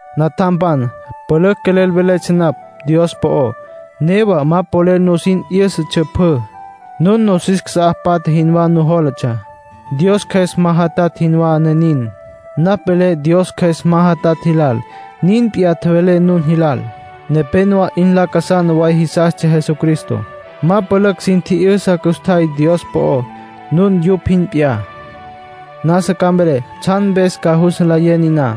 Natjampan, pülücj quelel veletsja napj Dios po'ó. Newa ma polel nusin 'yǘsatsja pjü; nun nosis casá patja jinwá nujólatsja, Dios Cjües ma jatatj jinwá, ne nin. Napj velé Dios Cjües ma jatatj jilal, nin p'iyá tjevelé nun jilal. Nepénowa 'in lacasana way jisastsja Jesucristo. Ma pülücj sin tji'yüsa custjay Dios po'ó. Nun yupj jin p'iyá. Nasa ca mvelé tsjan mpes ca jus nlayé niná.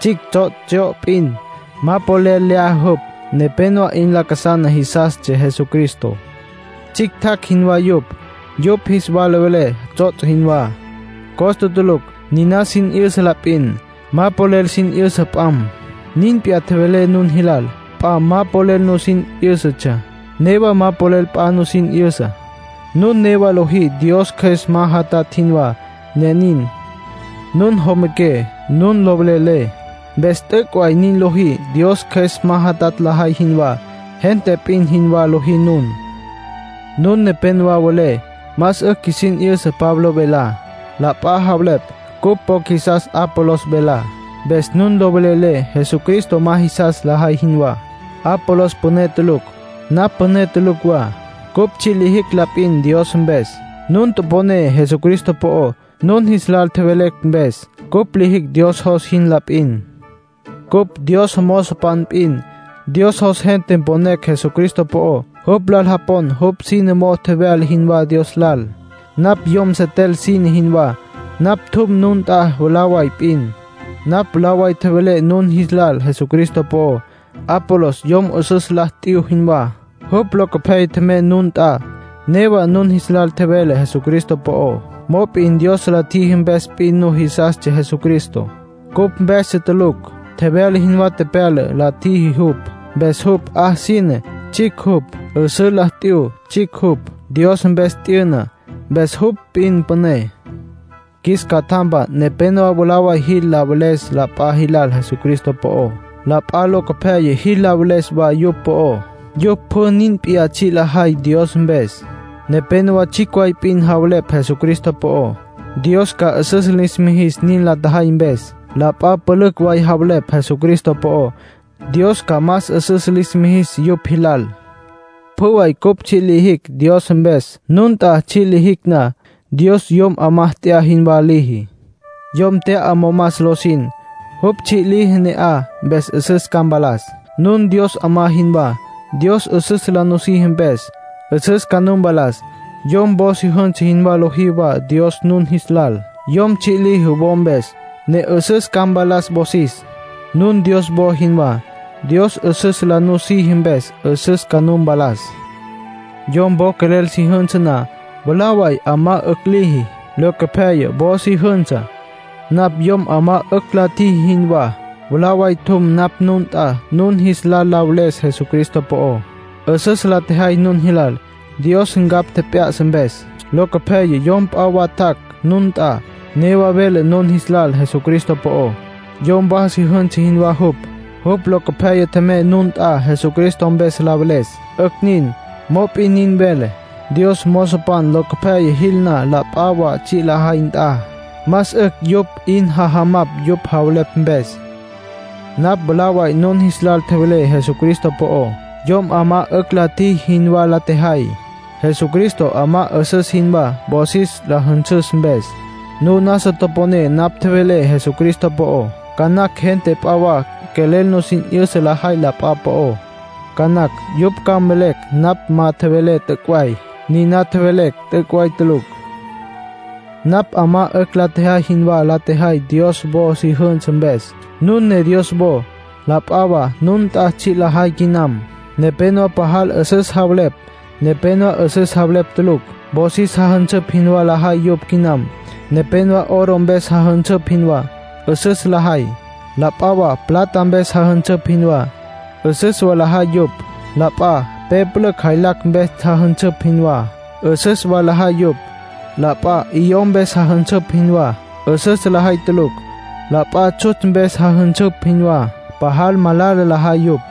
Tsjicj tsots' tsyo'o p'in. Ma polel lyaja jupj. Nepénowa 'in lacasana jisastsja Jesucristo; tsjictjacj jinwá yupj. Yupj jis lal velé tsots' jinwá; costa tulucj. Niná sin 'yüsa la p'in. Ma polel sin 'yüsa p'am. Nin p'iyá tjevelé nun jilal. P'a ma polel nusin 'yǘsatsja. Newa ma polel p'a nusin 'yüsa; nun newa lojí Dios Cjües ma jatatj jinwá, ne nin. Nun jomaqué. Nun lo velelé. Mpes t'üc' way nin lojí Dios Cjües ma jatatj lajay jinwá. Gente p'in jinwá lojí nun. Nun nepénowa welé: “Más 'ücj qjuisin 'yüsa Pablo velá.” La p'a javelepj: “Cupj po qjuisas Apolos velá”. Mpes nun lo velelé, Jesucristo ma jisas lajay jinwá. Apolos püné tulucj. Napj püné tulucj wa. Cupj tsji' lijicj la p'in Dios mpes. Nun toponé Jesucristo po'ó, nun jis lal tjevelecj mpes. Cupj lijicj Dios jos jin la p'in. Cupj Dios mozopan p'in. Dios jos gente mponecj Jesucristo po'ó. Jupj lal japon jupj sine mo'ó tjevyala jinwá Dios lal. Napj yom setel sine jinwá; napj tjum nun nt'a mwalá way p'in. Napj mwalá way tjevelé nun jis lal Jesucristo po'ó. Apolos yom 'üsǘ la t'yu jinwá; jupj locopyaya tjemey nun nt'a. Newa nun jis lal tjevele Jesucristo po'ó. Mop'in Dios la tjiji mpes p'in nujisastsja Jesucristo; cupj mpestsja tulucj. Tjevyala jinwá tepyala la tjiji jupj. Mpes jupj 'a sine, tsjicj jupj. 'Üsǘ la t'yu, tsjicj jupj. Dios mpes t'yüna, mpes jupj p'in püné. Qjuis catjampan nepénowa mwalá way jil la veles la p'a jilal Jesucristo po'ó. La p'a locopyaya jil la veles wa jupj po'ó. Yupj pjü nin p'iyá tsji' lajay Dios mpes. Nepénowa tsjicj way p'in javelepj Jesucristo po'ó. Dios ca 'üsüs lis mijis nin la tjajay mpes. La p'a pülücj way javelepj Jesucristo po'ó. Dios ca más 'üsüs lis mijis yupj jilal. Pjü way cupj tsji' lijicj Dios mpes, nun nt'a tsji' lijicj na. Dios yom 'amá tya'a jinwá liji. Yom tya'a momas lo sin. Jupj tsji' liji ne'aj, mpes 'üsüs ca mpalas. Nun Dios 'amá jinwá. Dios 'üsüs la nusiji mpes, 'üsüs ca nu mpalas. Yom wo si jünsa jinwá liji wa Dios nun jis lal. Yom tsji' liji wo mpes, ne 'üsüs ca mpalas wosis. Nun Dios wo jinwá. Dios 'üsüs la nusiji mpes, 'üsüs ca nu mpalas. Yom wo quelel si jünsa na, mwalá way 'amá 'ücj liji. Locopyaya wo si jünsa. Napj yom 'amá 'ücj la tjiji jinwá; mwalá way tjum napj nun nt'a nun jis lal la veles Jesucristo po'ó. 'Üsüs la tjejay nun jilal, Dios ncapj tjep'ya'sa mpes. Locopyaya yom p'a wa tjac' nun nt'a, newa vele nun jis lal Jesucristo po'ó. Yom wa si jünsa jinwá jupj; jupj locopyaya tjemey nun nt'a Jesucristo mpes la veles. 'Ücj nin. Mop'in nin velé: Dios mozopan locopyaya jil na la p'a wa tsji' la tjajay nt'a, más 'ücj yupj 'in jajamapj yupj javelepj mpes. Napj mwalá way nun jis lal tjevelé Jesucristo po'ó. Yom 'amá 'ücj la tjiji jinwá la tjejay. Jesucristo 'amá 'üsüs jinwá wosis la jünsüs mpes; nun nasa toponé napj tjevelé Jesucristo po'ó. Ca nacj gente p'a wa quelel nusin 'yüsa lajay la p'a po'ó. Ca nacj yupj ca mvelecj napj ma tjevelé t'üc' way. Niná mvelecj t'üc' way tulucj. Napj 'amá 'ücj la tjejay jinwá la tjejay Dios wo si jünsa mpes; nun ne Dios wo. La p'a wa nun nt'a tsji' lajay quinam. Nepénowa pajal 'üsüs javelepj, nepénowa 'üsüs javelepj tulucj. Wosis jajünsüpj jinwá lajay yupj quinam. Nepénowa oro mpes jajünsüpj jinwá; 'üsüs lajay. La p'a plata mpes jajünsüpj jinwá; 'üsüs wa lajay yupj. La p'a pe pülücj jaylacj mpes jajünsüpj jinwá; 'üsüs wa lajay yupj. La p'a 'iyó mpes jajünsüpj jinwá; 'üsüs lajay tulucj. La p'a tsjutsj mpes jajünsüpj jinwá; pajal malala lajay yupj.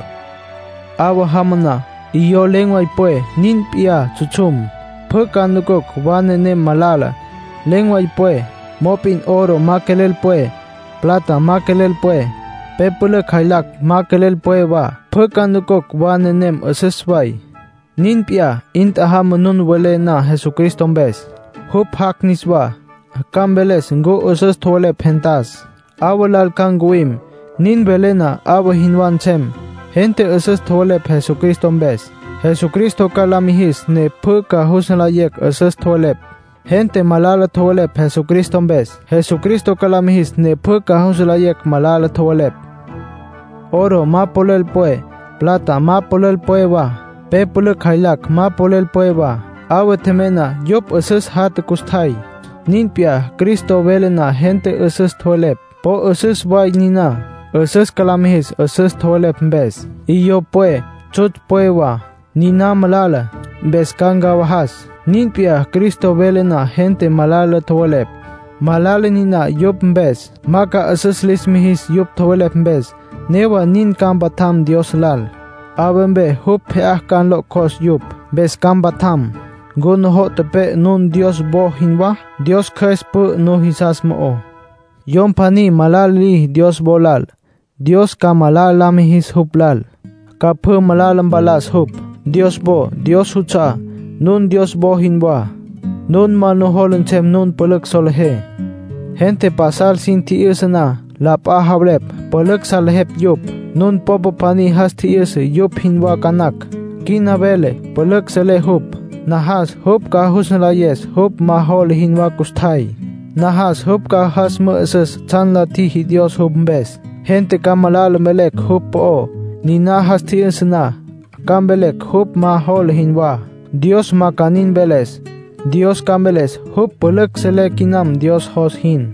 'Awa jama na, 'iyó len̈ way pwe, nin p'iyá tsjutsjum. Pjü ca nucucj wa nenem malala, len̈ way pwe. Mop'in oro ma quelel pwe, plata ma quelel pwe, pe pülücj jaylacj ma quelel pwe wa. Pjü ca nucucj wa nenem 'üsüs way. Nin p'iyá, 'in tjajama nun welé na Jesucristo mpes. Jupj jac' niswá, ca mveles ncu 'üsüs tjowelepj gentas. 'Awa lal ca ncuwim; nin vele na 'awa jinwá nsem. Gente 'üsüs tjowelepj Jesucristo mpes, Jesucristo ca la mijis ne pjü ca jus nlayecj 'üsüs tjowelepj. Gente malala tjowelepj Jesucristo mpes, Jesucristo ca la mijis ne pjü ca jus nlayecj malala tjowelepj. Oro ma quelel pwe, plata ma quelel pwe wa, pe pülücj jaylacj ma quelel pwe wa. 'Awa tjemey na, yupj 'üsüs jatja custjay. Nin p'iyá, Cristo vele na gente 'üsüs tjowelepj, po 'üsüs way niná. 'Üsüs ca lis mijis 'üsüs tjowelepj mpes. 'Iyó pwe, tsjutsj pwe wa. Niná malala, mpes ca ncawajas. Nin p'iyá, Cristo vele na gente malala tjowelepj, malala niná yupj mpes. Ma ca 'üsüs lis mijis yupj tjowelepj mpes. Newa nin, ca mpatjam Dios lal. 'Awa mpe jupj pje'á ca la nlo'cjos yupj, mpes ca mpatjam. ¿Ncu nujo' tepe'e nun Dios wo jinwá? Dios Cjües pü'ü nujisas mo'ó. Yom pjaní malala liji Dios wo lal, Dios ca malala la mijis jupj lal. Ca pjü malala mpalas jupj. Dios wo Dios juts'a'á. Nun Dios wo jinwá. Ma nujola nsem nun pülücj solejé. Gente pasal sin tji'yüsa na, la p'a javelepj pülücj salejepj yupj. Nun popa pjaní jas tji'yüsa yupj jinwá ca nacj. Quina vele pülücj selé jupj. Najas jupj ca jus nlayes jupj ma jola jinwá custjay. Najas jupj ca jas mü'üsüs tsjan la tjiji Dios jupj mpes. Gente ca malala mvelecj jupj po'ó, niná jas tji'yüsa na; ca mvelecj jupj ma jola jinwá. Dios ma ca nin mveles; Dios ca mveles jupj pülücj selé quinam Dios jos jin.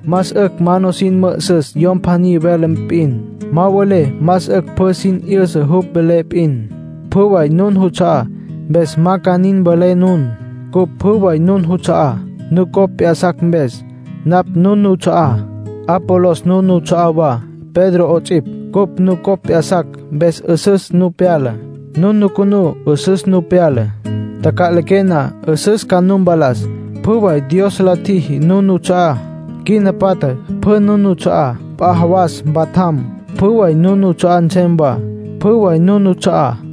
Más 'ücj ma nusin mü'üsüs yom pjaní vele p'in. Ma mvelé más 'ücj pjü sin 'yüsa jupj vele p'in. Pjü way nun nuts'a'á, mpes ma ca nin mvelé nun. Cupj pjü way nun nuts'a'á, nucopj p'ya'sacj mpes. Napj nun nuts'a'á. Apolos nun nuts'a'á wa, Pedro 'ots'ipj. Cupj nucopj p'ya'sacj, mpes 'üsüs nu pyala. Nun nucunú, 'üsüs nu pyala. Taca'liqué na, 'üsüs ca nu mpalas. Pjü way Dios la tjiji, nun nuts'a'á. Quina patja, pjü nun nuts'a'á. P'a jawas mpatjam, pjü way nun nuts'a'á nsem wa. Pjü way nun nuts'a'á.